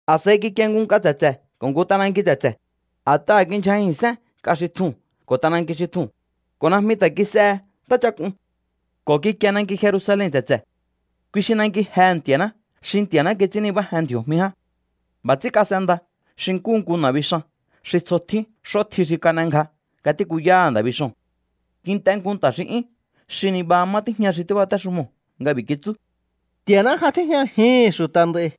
A̱s'a̱i kikie nku nk'a tse̱tse̱ ko̱ nku t'ananki tse̱tse̱, a̱t'aha̱ kindyjajin sén nk'a xi tjuu̱n ko̱ t'ananki xi tjuu̱n, ko̱ najmi ta̱ kis'ehe ntáchak'un. Ko̱ kikie nanki Jerusalen tse̱tse̱. Kui xi nanki jehe̱ Nti̱a̱ná xi Nti̱a̱ná kits'ín nibájen ndji̱o̱jmi ján. B'a̱ ts'ín kas'enda xi nkúhu nku na̱bixan xi tsjo tjín x'ótji xi kan'engja nga tíkuyaha̱ nda̱ bixoo̱n. Kint'e nku nta̱ xi 'yún xi nibaha má tíjña xi tíbatéxumoo̱ nga b'i̱ kitsú: —Nti̱a̱ná ja tíjñajihi̱n xu̱ta̱ nd'a̱i̱.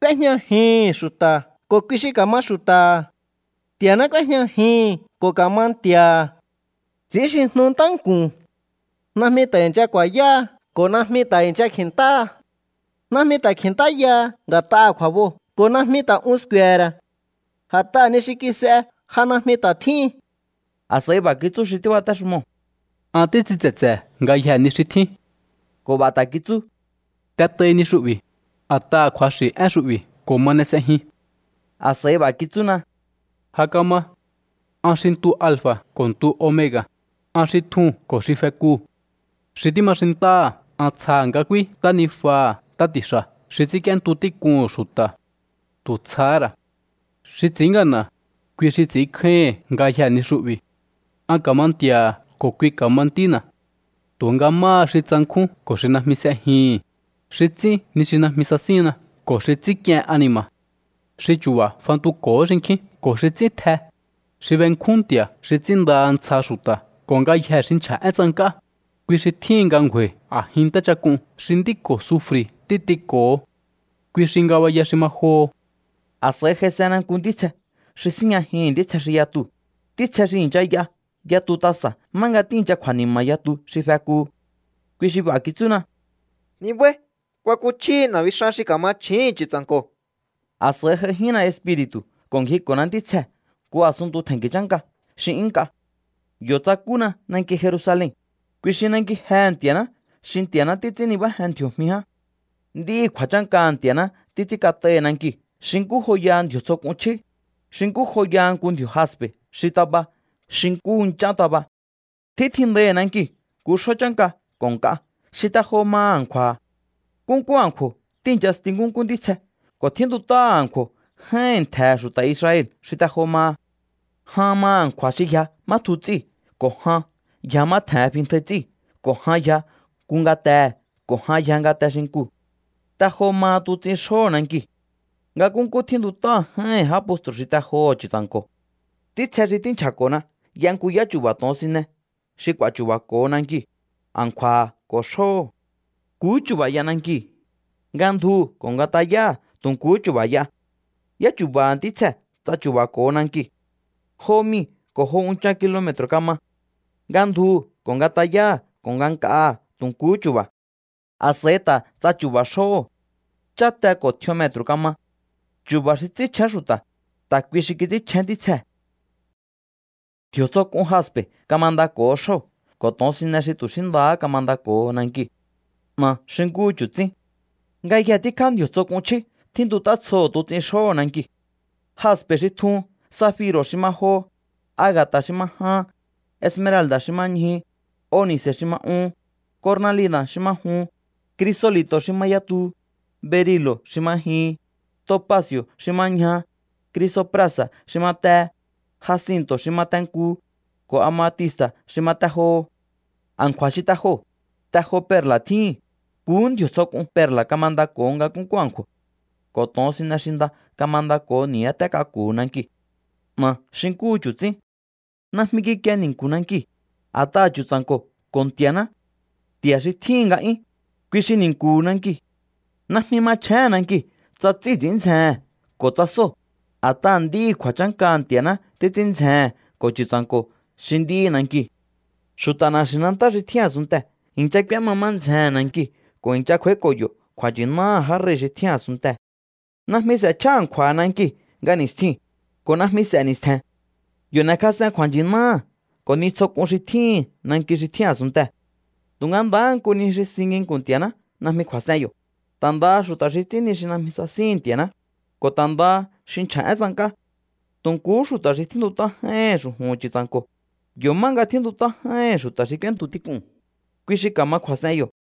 K'úéjñajihi̱n xu̱ta̱ ko̱ kui xi ka̱ma xu̱ta̱ha̱. Nti̱a̱ná k'úéjñajihi̱n ko̱ ka̱ma Nti̱a̱ha̱. Ts'i̱ínxijnu ntánku̱n. Najmi ta̱ i̱ncha ku̱a̱yáha ko̱ najmi ta̱ i̱ncha kji̱ntáha. Najmi ta̱ kji̱ntáyaha nga̱t'aha̱ kju̱a̱boo̱ ko̱ najmi ta̱ un sku̱e̱he̱ ra̱. A̱t'aha̱ ni xi kis'e ja najmi ta̱ tjíhin. A̱s'a̱i b'a̱ kitsú xi tíbatéxumoo̱: —An títs'in tse̱tse̱ ngayjee̱ ni xi tjín. Ko̱ b'a̱ ta̱ kitsú: —T'et'ai ni xu'bi̱, a̱t'aha̱ kju̱axi̱ én xu'bi̱ ko̱ ma n'e s'ejin. A̱s'a̱i b'a̱ kitsúna: —Ja kama. An xi ntu alfa̱ ko̱ ntu omega̱, an xi tjuu̱n ko̱ xi fekuu̱. Xi tíma xintáha̱ an tsjaha̱ nga k'úí ntánijuaha̱ ntá ti̱xa̱ xi ts'ínk'íéntu tík'uhu̱n xu̱ta̱. Tu̱ tsjahá ra̱. Xi ts'i̱ín ngana̱, kui xi ts'i̱ínkjáíhi̱n ngayjee̱ ni xu'bi̱. An ka̱ma Nti̱a̱ha̱ ko̱ kui ka̱ma ntína̱. Tu̱nga máha xi tsankjún ko̱ xi najmi s'ejihi̱n, xi ts'ín ni xi najmi sasínna ko̱ xi ts'ínk'ien ani̱ma̱, xi chu̱ba̱ fantuko̱hó xinkjín ko̱ xi ts'ín tj'e, xi benkjún nti̱a̱ xi ts'ínndaha ntsja xu̱ta̱ ko̱ ngayjee̱ xi nchja̱ én tsank'á, kui xi tjíhin nga ngju̱a̱i̱ a̱jin ntáchak'un xi nd'í ko̱ sufri̱ títiko̱ho. Kui xi ngabaya xi ma joho. A̱s'a̱i j'aisena nku ntítsje xi síjñajihi̱n ntítsje xi yatuu̱, ntítsje xi i̱ncha y'a yatu tasa̱ má nga tíi̱ncha kju̱a̱ni̱ma̱ yatu xi fekuhu. Kui xi b'a̱ kitsúna: —Nibái̱. Kuakuchjíhi na̱bixan xi ka̱ma chju̱úhu̱n Chu̱tsa̱nko̱. A̱s'a̱i j'aijínna Espiri̱tu̱ ko̱ ngjiko̱na ntítsjee̱ nku a̱sunntu tje̱nki̱ chánka xi 'yún nk'a. Yo̱ tsakúna nanki Jerusalen, kui xi nanki jehe̱ Nti̱a̱ná xi Nti̱a̱ná títs'ín nibájen ndji̱o̱jmi ján. Nd'íhi̱ kju̱a̱chánkaha̱ Nti̱a̱ná títs'ín kat'aihi̱ nankiu̱ xi nkú joyaha ndji̱o̱ tsjo k'un chjí, xi nkú joyaha nku ndji̱o̱ jaspe̱ xi taba xi nkúhu nch'án taba. Tjítjindaihi̱ nankiu̱ nku xjó chánka ko̱ nk'a xi te jo maha a̱nkju̱a̱ha̱. Nkúnkú a̱nkju̱o̱ tíi̱nchasti nkúnkú ntítsje ko̱ tjíntut'áha̱ a̱nkju̱o̱ j'áíhi̱n ntje̱he̱ xu̱ta̱ Israel xi te jo maha. Jan maha̱ a̱nkju̱a̱ xi yja má tju ts'íu̱ ko̱ jan yja má xi tje̱hen fintjai ts'íu̱ ko̱ jan yja nku ngatehe̱ ko̱ jan yja ngate xinkuu̱. Te jo maha tuts'in xjóho̱ nankiu̱. Nga nkúnkú tjíntut'á j'áíhi̱n já postru̱ xi te joho̱ Chu̱tsa̱nko̱. Ntítsje xi tínchja̱ko̱na y'a nku yáchu̱ba̱ to̱onsine xi k'u̱a̱ chu̱ba̱ko̱ho nankiu̱, a̱nkju̱a̱ha̱ ko̱ xjóho̱. Nkuhú chu̱ba̱ y'a nankiu̱. Nga ndjuhu̱ ko̱ nga tayáha̱ tu̱ nkuhú chu̱ba̱ y'a. Yáchu̱ba̱ha̱ ntítsjee̱ ts'achu̱ba̱ko̱ho nankiu̱. Jo mii̱ ko̱ jo unchan kilome̱tru̱ kama. Nga ndjuhu̱ ko̱ nga tayáha̱ ko̱ nga nk'aha̱ tu̱ nkuhú chu̱ba̱. A̱s'a̱i ta̱ ts'achu̱ba̱ xjóho̱. Cháte ko̱ tj'ion metru̱ kama. Chu̱ba̱ xi ts'ínchjén xu̱ta̱, ta̱ kui xi kits'ínchjén ntítsjee̱. Ndji̱o̱ tsjo k'un jaspe̱ kamandako̱ho xjóo̱ ko̱ to̱onsine xi tu̱ xí ndahá kamandako̱ho nankiu̱. 'Na̱ xi nkúhu chu̱tsín. Ngayje tíkjá ndji̱o̱ tsjo k'un chjí tjíntut'á tsjoho̱ tuts'in xjóho̱ nankiu̱, jaspe̱ xi tjuu̱n, zafiro̱ xi ma joho, aga̱ta̱ xi ma jahan, esmeralda̱ xi ma ñjuhu, oni̱ce̱ xi ma uhun, cornalina̱ xi ma juhun, crisoli̱to̱ xi ma yatuhu, berilo̱ xi ma jihin, topaci̱o̱ xi ma ñjaha, crisoprasa̱ xi ma tehe, jacinto̱ xi ma te nkuhu, ko̱ amatista̱ xi ma te joho. A̱nkju̱a̱ xi te joo̱, te jo perla̱ tjíhin. Nkuhú ndji̱o̱ tsjo k'un perla̱ kamandako̱ho nga nkúnkú a̱nkju̱o̱. Ko̱ to̱onsine xi nda kamandako̱ho ni̱yáté k'aku̱hu̱ nankiu̱. 'Na̱ xi nkúhu chu̱tsín. Najmi kikie ni̱nku̱ nankiu̱, a̱t'aha̱ Chu̱tsa̱nko̱ ko̱ Nti̱a̱ná, Nti̱a̱ xi tjíhi̱n nga'yún, kui xi ni̱nku̱hu̱ nankiu̱. Najmi machjéhe̱n nankiu̱ tsa ts'íu̱ ts'i̱ín ndzjehe̱n ko̱ tsa sóo̱, a̱t'aha̱ nd'íhi̱ kju̱a̱chánkaha̱ Nti̱a̱ná títs'ín ndzjehe̱n ko̱ Chu̱tsa̱nko̱ xi nd'íhi̱ nankiu̱. Xu̱ta̱ na̱xi̱nantá xi tjín a̱sunntee̱ i̱ncha k'úéma má ndzjehe̱n nankiu̱ ko̱ i̱ncha kj'u̱a̱íko̱ yo̱ kju̱a̱nchi̱náha̱ já rei̱ xi tjín a̱sunntee̱. Najmi s'e̱chja a̱nkju̱a̱ha̱ nankiu̱ nga ni̱stjiu̱n, ko̱ najmi s'e̱ ni̱stje̱n. Yo̱ n'e̱kjas'en kju̱a̱nchi̱náha̱ ko̱ ni tsjo k'un xi tjíhi̱n nanki xi tjín a̱sunntee̱. Tu̱nga ndahá nku ni xi si nginku̱n Nti̱a̱ná najmi kju̱a̱s'en yo̱, ta̱ ndaha xu̱ta̱ xi ts'ín ni xi najmi sasíhi̱n Nti̱a̱ná, ko̱ ta̱ ndaha xi nchja̱ én tsank'á. Tu̱ nkuhú xu̱ta̱ xi tjíntut'á j'áíhi̱n xu̱ju̱hu̱n Chu̱tsa̱nko̱, yo̱ má nga tjíntut'á j'áíhi̱n xu̱ta̱ xi k'úéntu tík'uu̱n, kui xi ka̱ma kju̱a̱s'en yo̱.